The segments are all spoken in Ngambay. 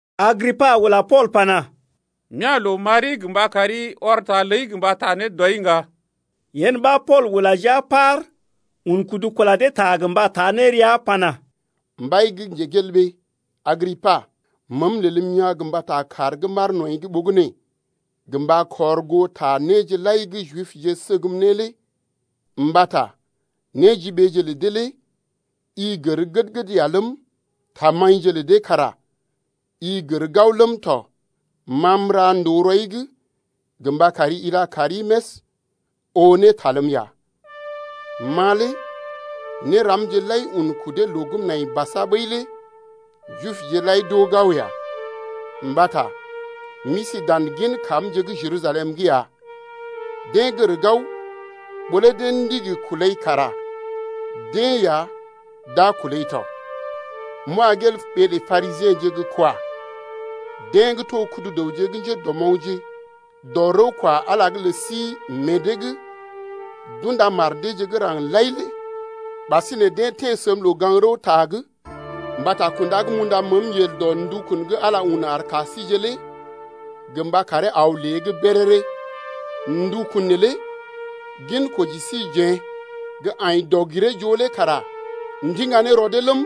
Agripa ula Pool pana: M’ya̰ loo m’ari gə mba kari ɔr ta ləi gə mba taa ne dɔi ŋga. Yen ɓa Pool ula jia paar un kudu kula dee ta gə mba taa ne rəa pana: Mbai, Agripa, məəm lelm yaa̰ gə mbata kaar gə́ m’aar nɔḭ’g ɓogənè gə mba kɔr goo ta néje lai gə́ Jibje səgm ne lé, mbata néjiɓeeje lə dee lé i gər gəd-gəd ya ləm, tamaḭje lə dee kara i gər gao ləm tɔ. Ma m’ra ndòo rɔi’g gə mba kari ila kaari més oo ne ta ləm ya. Ma lé néramje lai un kudee loo gə́ m’nai basa ɓəi lé Jibje lai d’oo gao ya, mbata m’isi dan gin kamje’g Jerusalem’g ya. Deḛ gər gao, ɓó lé deḛ ndigi kulai kara deḛ ya d’a kulai to m’wa gel ɓee lə Parisiḛje gə́ kwa, deḛ gə́ to kudu-dəwje gə́ njédɔmoŋgje dɔ rəw kwa Ala’g lə sí meḛ dee’g d’unda mar deeje gə́ raŋg lai lé. Ɓasinè deḛ teḛ səm loo-gaŋg-rəwta’g mbata kunda gə́ m’unda məəm yel dɔ ndukun gə́ Ala un ar ka síje lé gə mba karee aw lée’g béréré. Ndukun neelé ginkoji síjeḛ gə́ aḭ dɔg-giree-joo lé kara ndiŋga ne rɔ dee ləm,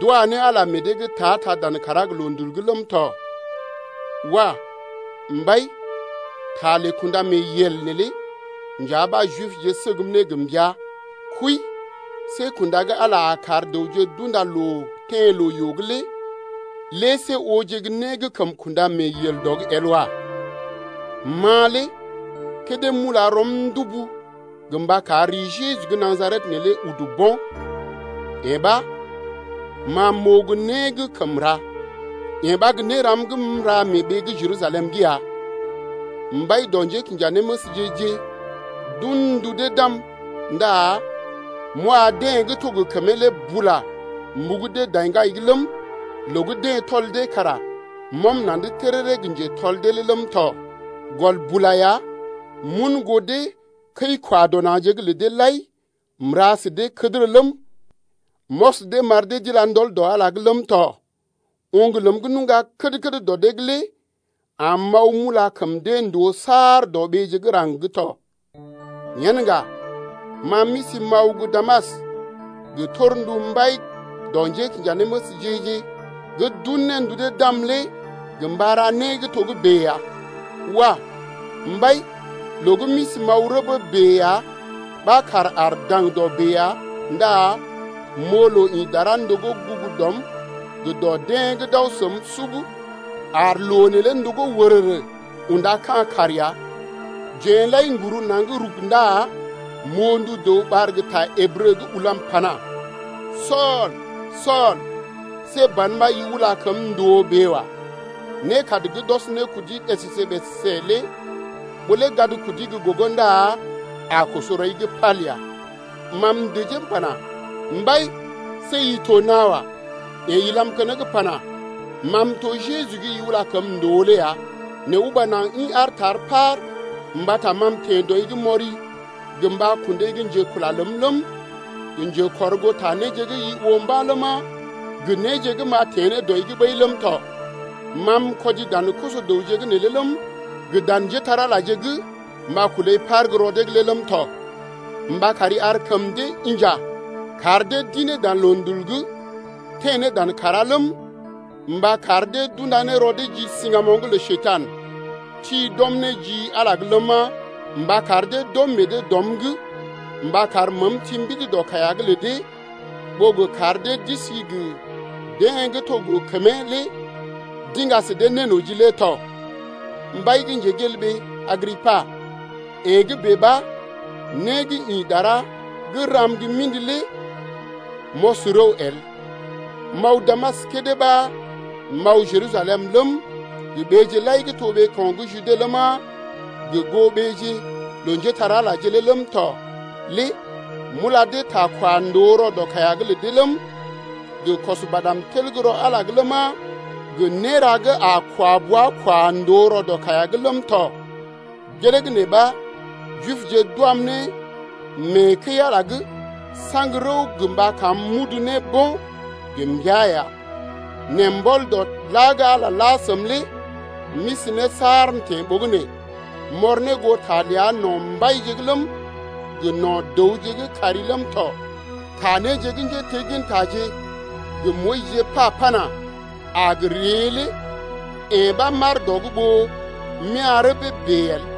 d’wa ne Ala lé meḛ dee’g ta-ta dan kàrá gə loondul’g ləm tɔ. Wah mbai, ta lə kṵdameeyel neelé nja ɓa Jibje səgm ne gə mbəa. Kwii, see kunda gə́ Ala a kar dəwje d’unda loo teḛ loo-yoo’g lé see ooje né gə́ kəm kunda mee yel dɔ’g el wa. Ma lé kédé m’ula rɔm ndubu gə mba kar ri Jeju gə́ Najaret neelé udu bo̰, yee ɓa ma m’oo gə́ né gə́ kəm ra. Yee ɓa gə́ néram gə́ m’ra mee ɓee gə́ Jerusalem’g ya. Mbai dɔ njékinjanéməsje-je d’un ndu dee d’am ndá m’wa deḛ gə́ to gə kəmee lé bula m’ɓugu dee daŋgai’g ləm, loo gə́ deḛ tɔl dee kara m’ɔm na̰’d téréré gə njétɔl deeje lé ləm tɔ. Gɔl bula ya m’un goo dee kəi-kwa-dɔ-na̰je’g lə deḛ lai m’ra sə dee né gə́ kədərə ləm, m’ɔs dee m’ar dee d’ila ndɔl dɔ Ala’g ləm tɔ. Oŋg ləm gə́ nuŋga kəd-kəd dɔ dee’g lé am m’aw m’ula kəm dee ndòo saar dɔ ɓeeje’g raŋg’d tɔ. Yen ŋga ma m’isi m’aw ne gə́ Damas gə́ torndu mbai dɔ njékinjanéməsje-je gə́ d’un ne ndu dee d’am lé gə mba ra né gə́ togə́bè ya. Wah! Mbai, loo gə́ m’isi m’aw gə́ rəbee bèe ya ɓa kàr aar daŋdɔ bèe ya ndá m’oo loo ḭ dara ndogó gugu dɔm gə dɔ deḛ gə́ d’aw səm lé sub, ar loo neelé ndogó wərərə unda ka̰ kàr ya. Jeḛ lai n’guru naŋg rug ndá m’oo ndu dəw ɓar gə ta Ǝbrə gə́ ulam pana: Sool, Sool, see ban ɓa i ula kəm ndòo bèe wa. Nékad gə́ d’ɔs ne kudi ɓèsèsè-ɓèsèsè lé ɓó lé gad kudi gə́ gogo ndá a koso rɔi’g pal ya. Ma m’dəjee m’pana: Mbai, see i to nawa. Yeḛ ilam keneŋ pana: Ma m’to Jeju gə́ i ula kəm ndòo lé ya. Nɛ uba naŋg ḭ aar tar paar mbata ma m’teḛ dɔi’g, mbata ma m’teḛ dɔi’g m’ɔri gə mba kundai gə́ njekula ləm ləm, gə njekɔrgoota néje gə́ i oo mba̰ ləma, gə néje gə́ m’a teḛ ne dɔi’g ɓəi ləm tɔ. Ma m’kɔdi dan koso-dəwje’g neelé ləm, gə dan njépole-magəje gə́ m’a gə kulai par gə́ rɔ dee’g lé ləm tɔ, mba kari ar kəm dee inja, kar dee d’ḭ ne dan loondul’g teḛ ne dan kàrá ləm, mba kar dee d’unda rɔ dee ji siŋgamoŋ’g lə Njekurai ti d’ɔm ne ji Ala’g lé ləma, mba kar dee d’ɔm meḛ dee dɔm’g mba kar məəm ti mbidi dɔ kaiya’g lə dee ɓó gə kar dee d’isi gə deḛ gə́ to gə kəmee lé d’iŋga sə dee nénoji lé tɔ. Mbai Agripa, yee gə́ bèe ɓa né gə́ ḭ dara gə́ ram gə́ mḭdi lé m’ɔs rəw el. M’aw Damas kédé ɓa m’aw Jerusalem ləm, gə ɓeeje lai gə́ to ɓeeko̰ gə́ Jude ləma, gə goo ɓeeje lə njépole-magəje lé ləm tɔ lé m’ula dee ta kwa ndòo rɔ dɔ kaiya’g lə dee ləm, gə kɔs badm tel gə́ rɔ Ala’g ləma, gə néra gə́ a kwa bua kwa ndòo rɔ dɔ kaiya’g ləm tɔ. Gelee gə́ nee ɓa Jibje d’wam ne mee kəi-Ala saŋg rəw gə mba kam m’udu ne bo̰ gə mbəa ya. Nɛ mbɔl dɔ la gə́ Ala lé la səm lé m’isi ne saar m’teḛ ɓogənè m’ɔr ne goo ta ləa no̰ mbaije’g ləm, gə no̰ dəwje gə́ kari ləm tɔ. Ta néje gə́ njéteggintaje ləm gə Moyis pa ləm pana: A gə ree lé yee ɓa m’aar dɔ’g ɓó m’ya̰ rəbee bèe el.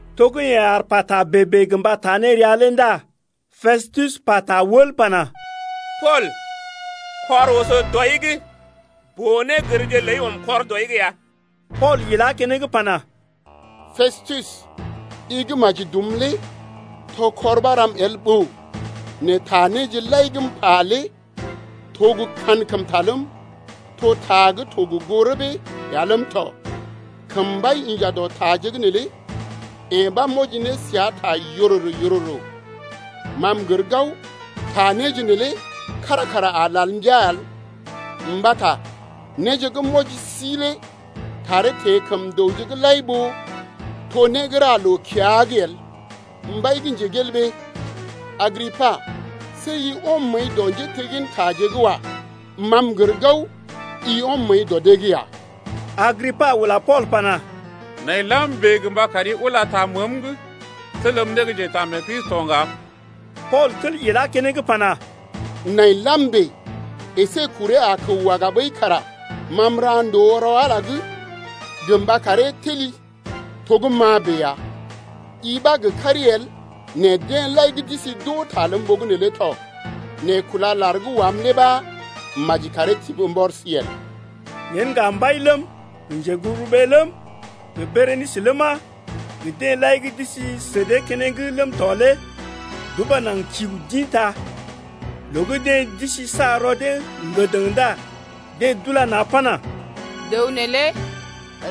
To gə́ yeḛ aar pata bèe-bèe gə mba taa ne rəa lé ndá Pestus pata wəl pana: Pool, kɔr oso dɔi’g! Boo-négərje ləi ɔm kɔr dɔi’g ya. Pool ilá keneŋ pana: Pestus, i gə́ maji dum lé to kɔr ɓa ram el ɓòo. Nɛ ta néje lai gə́ m’pa lé to gə́ kankəmta ləm, to ta gə́ to gə goo rəbee ya ləm tɔ. Kəm mbai inja dɔ taje’g neelé yee ɓa m’wɔji ne səa ta yororo-yororo, ma m’gər gao, ta néje neelé kára kara a lal mbia el, mbata néje gə́ m’wɔji sí lé taree teḛ kəm dəwje’g lai ɓó to né gə́ ra loo-kiya’g el. Mbai Agripa, see i ɔm məəi dɔ njéteggintaje’g wa. Ma m’gər gao, i ɔm məəi dɔ dee’g ya. Agripa ula Pool pana: Nai lam bèe gə mba kari ula ta məəm’g telm ne gə́ njetaamee-Kristi to ŋga. Pool tel ilá keneŋ pana: Nai lam bèe əsé kuree a kəw waga ɓəi kara ma m’ra ndòo rɔ Ala’g gə mba karee teli to gə́ ma bèe ya, i ɓa gə kari el nɛ deḛ lai gə́ d’isi d’oo ta ləm ɓogənè lé tɔ, nɛ kúla lar gə́ wam lé ɓa maji karee tibi mbɔri sí el. Yen ŋga mbai ləm, gə njeguburuɓee ləm, gə Berenisə ləma, gə deḛ lai gə́ d’isi sə dee keneŋ ləm tɔ lé d’uba naŋg kiu d’ḭta. Loo gə́ deḛ d’isi sa rɔ dee ŋgədəŋ ndá deḛ d’ula na̰ pana: Dəw neelé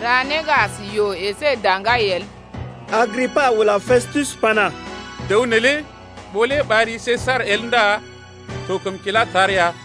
ra né gə́ as yoo əsé daŋgai el. Agripa ula Pestus pana: Dəw neelé ɓó lé ɓar ri Sesar el ndá to kəm kila tar ya.